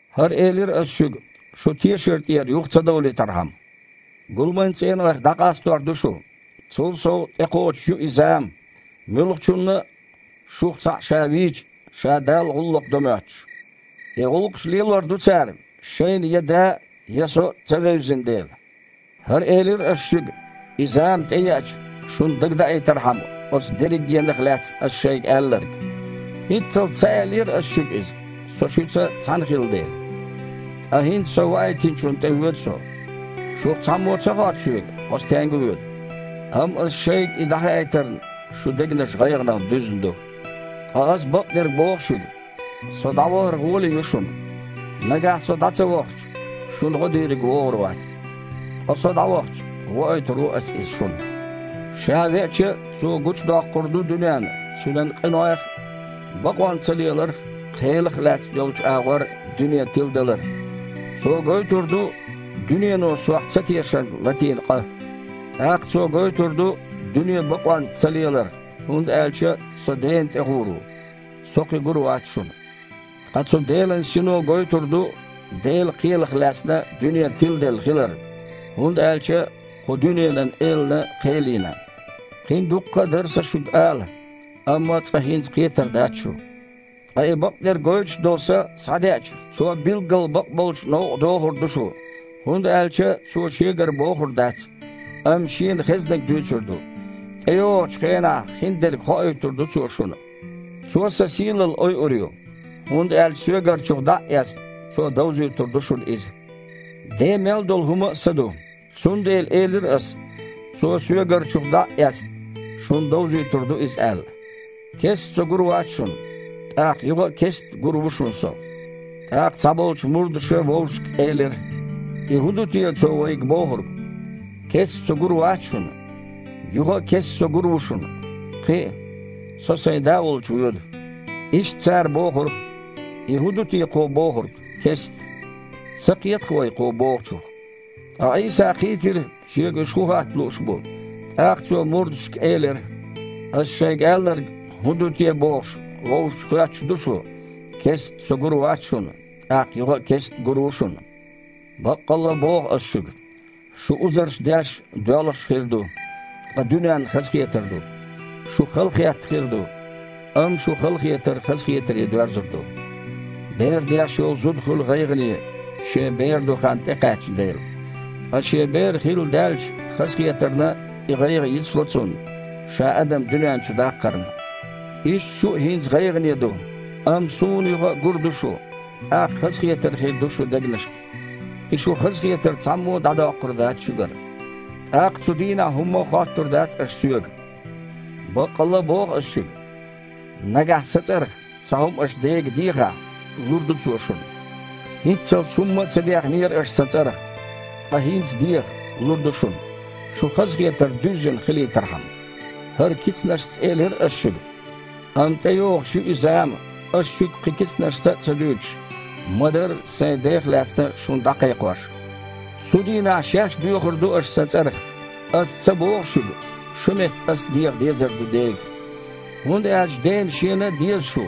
«ХІара элира Ас шуьга, шу тешар тІера юха ца довлийтархьама. Гуламан цІенойх дІакъастор ду шу. Цул сов, тІекхочуш ю и зама, муьлххачунна а, шух цхьаъ ша вийча, ша Далла гІуллакх до моьттуш. И гІуллакхаш лелор ду цара, шайна я Да а, я Со а ца вевзина дела. ХІара элира Ас шуьга, и зама тІееача, шуна дагадаийтархьама оцу дерригенах лаьцна Ас шайга аьлларг». «ХІинццалц ца аьллера Ас шуьга иза, Со шуьца цхьаьна хилла дела. Ткъа хІинца Со Ваийтинчунна тІевоьду Со. Шух цхьаммо а ца хотту Соьга: „Хьо стенга воьду?“ Амма Аса шайга и дІахаийтарна, шун дегнаш гІайгІанах дуьзна ду. Ткъа Аса бакъдерг боху шуьга: „Со дІавахар гІоле ю шуна“. Нагахь Со дІа ца вахча, шуна гІо Дийриг вогІур вац, ткъа Со дІавахча, воуьйтур ву Ас Иза шуна. Ша веача, Цо гучудоккхур ду дуьненна цуьнан къинойх а, бакъонцалеларх а, кхелах а лаьцна йолчу агІор дуьне тиладалар. Цо гойтур ду дуьнено Сох цатешарна латийна къа. ТІаккха Цо гойтур ду дуьне бакъонца цалелар, хІунда аьлча Со Дена тІе гІур ву. Со кхин гур вац шуна. Ткъа цу Делан Сино гойтур ду Делан кхелах лаьцна дуьне тиладелла хилар, хІунда аьлча кху дуьненан элана кхел йина. Кхин а дуккха дара Сан шуьга ала, амма цкъа хІинца кхетар дац шу. Ткъа и бакъдерг гойтуш долу Са схьадеача, Цо билггал бакъболчу новкъа дохур ду шу, хІунда аьлча Цо Шегара бохур дац, амма Шена хезнарг дуьйцур ду, тІейогІучу хенахь хиндерг хоуьйтур ду Цо шуна. Цо Сан сийлалла ойур ю, хІунда аьлча Соьгарчух дІа а эцна, Цо довзуьйтур ду шуна иза. Ден мел долу хІума а Сан ду. Цундела элира Ас, Цо, Соьгарчух дІа а эцна, шуна довзуьйтур ду иза аьлла». «Кестта Со гур вац шуна. ТІаккха юха а кестта гур ву шуна Со». ТІаккха цхьаболчу мурдаша вовшашка элира: «И хІун ду те Цо вайга бохург: „Кестта Со гур вац шуна, юха а кестта Со гур ву шуна?“ Кхин а: „Со Сайн Да волчу воьду“?» Иштта цара бохура: «И хІун ду те Кхо бохург: „Кестта“? Ца кхета-кх вай Кхо бохучух». Ткъа Іийса кхийтира, Шега уьш хІун хатта лууш бу. ТІаккха Цо мурдашка элира: «Ас шайга аьлларг хІун ду те бохуш, вовшашка хоьттуш ду шу: „Кестта Со гур вац шуна, тІаккха юха а кестта гур ву шуна“? Баккъалла боху Ас шуьга: Шу узарш деш а, доьлхуш а хир ду, ткъа дуьненна хазахетар ду. Шу халахетта хир ду, амма шун халахетар хазахетаре доьрзур ду. Бер деш йолу зуда хуьлу гІайгІане, шен бер до хан тІекхаьчна дела, ткъа шен бер хилла даьлча, хазахетарна и гІайгІа йицло цунна, ша адам дуьнен чу даккхарна. Иштта шу а хІинца гІайгІане ду, амма Суна юха гур ду шу, тІаккха хазахетар хир ду шун дегнашна. И шун хазахетар цхьаммо а дІадоккхур дац шуьгара. ТІаккха цу дийнахь хІумма а хоттур дац аша Соьга. Баккъалла боху Ас шуьга: нагахь Сан цІарах цхьа хІума аша Дега дехахь, лур ду Цо шуна. ХІинццалц хІумма а ца дехнера аша Сан цІарах. Ткъа хІинца деха, лур ду шуна, шун хазахетар дуьззина хилийтархьама». «ХІара кицанашца элира Ас шуьга. Амма тІейогІуш ю и зама, Ас шуьга кхин кицанашца а ца дуьйцуш, ма-дарра Сайн Дех лаьцна шуна дІакхайкхош. Цу дийнахь шаьш доьхур ду аша Сан цІарах. Ас ца боху шуьга, шун метта Ас деха дезар ду Дега. ХІунда аьлча Дена Шена а деза шу,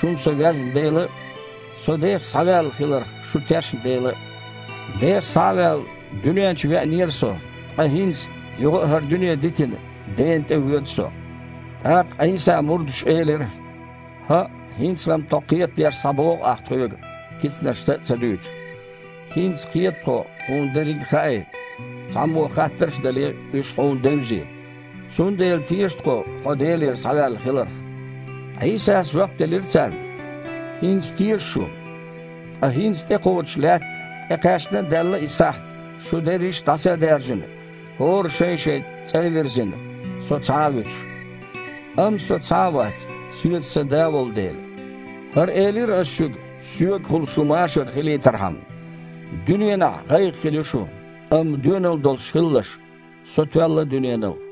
шуна Со везна дела а, Со Дех схьаваьлла хиларх шу тешна дела а. Дех схьа а ваьлла, дуьнен чу веанера Со, ткъа хІинца, юха а хІара дуьне дитина, Дена тІевоьду Со». ТІаккха Іийсан мурдаша элира: «ХІаъ, хІинца-м тхо кхетадеш схьабоху Ахь тхоьга, кицанашца а ца дуьйцуш. ХІинца кхета тхо Хьуна дерриг хаьий, цхьаммо хаттарш а дале, уьш Хьуна девзий. Цундела теша тхо Хьо Делера схьаваьлла хиларх». Іийсас жоп делира царна: «ХІинца теша шу? Ткъа хІинца тІекхоччуш лаьтта, тІекхаьчна а даьлла и сахьт, шу дерриш а дІаса а даьржина, хІора а шайн-шайн цІа а вирзина, Со цхьа а вуьтуш. Амма Со цхьа вац, Соьца Сан Да волу дела. ХІара элира Ас шуьга, Соьгахула шун машар хилийтархьама. Дуьненахь гІайгІа хир ю шун, амма доьналла долуш хилалаш! Со тоьлла дуьненал».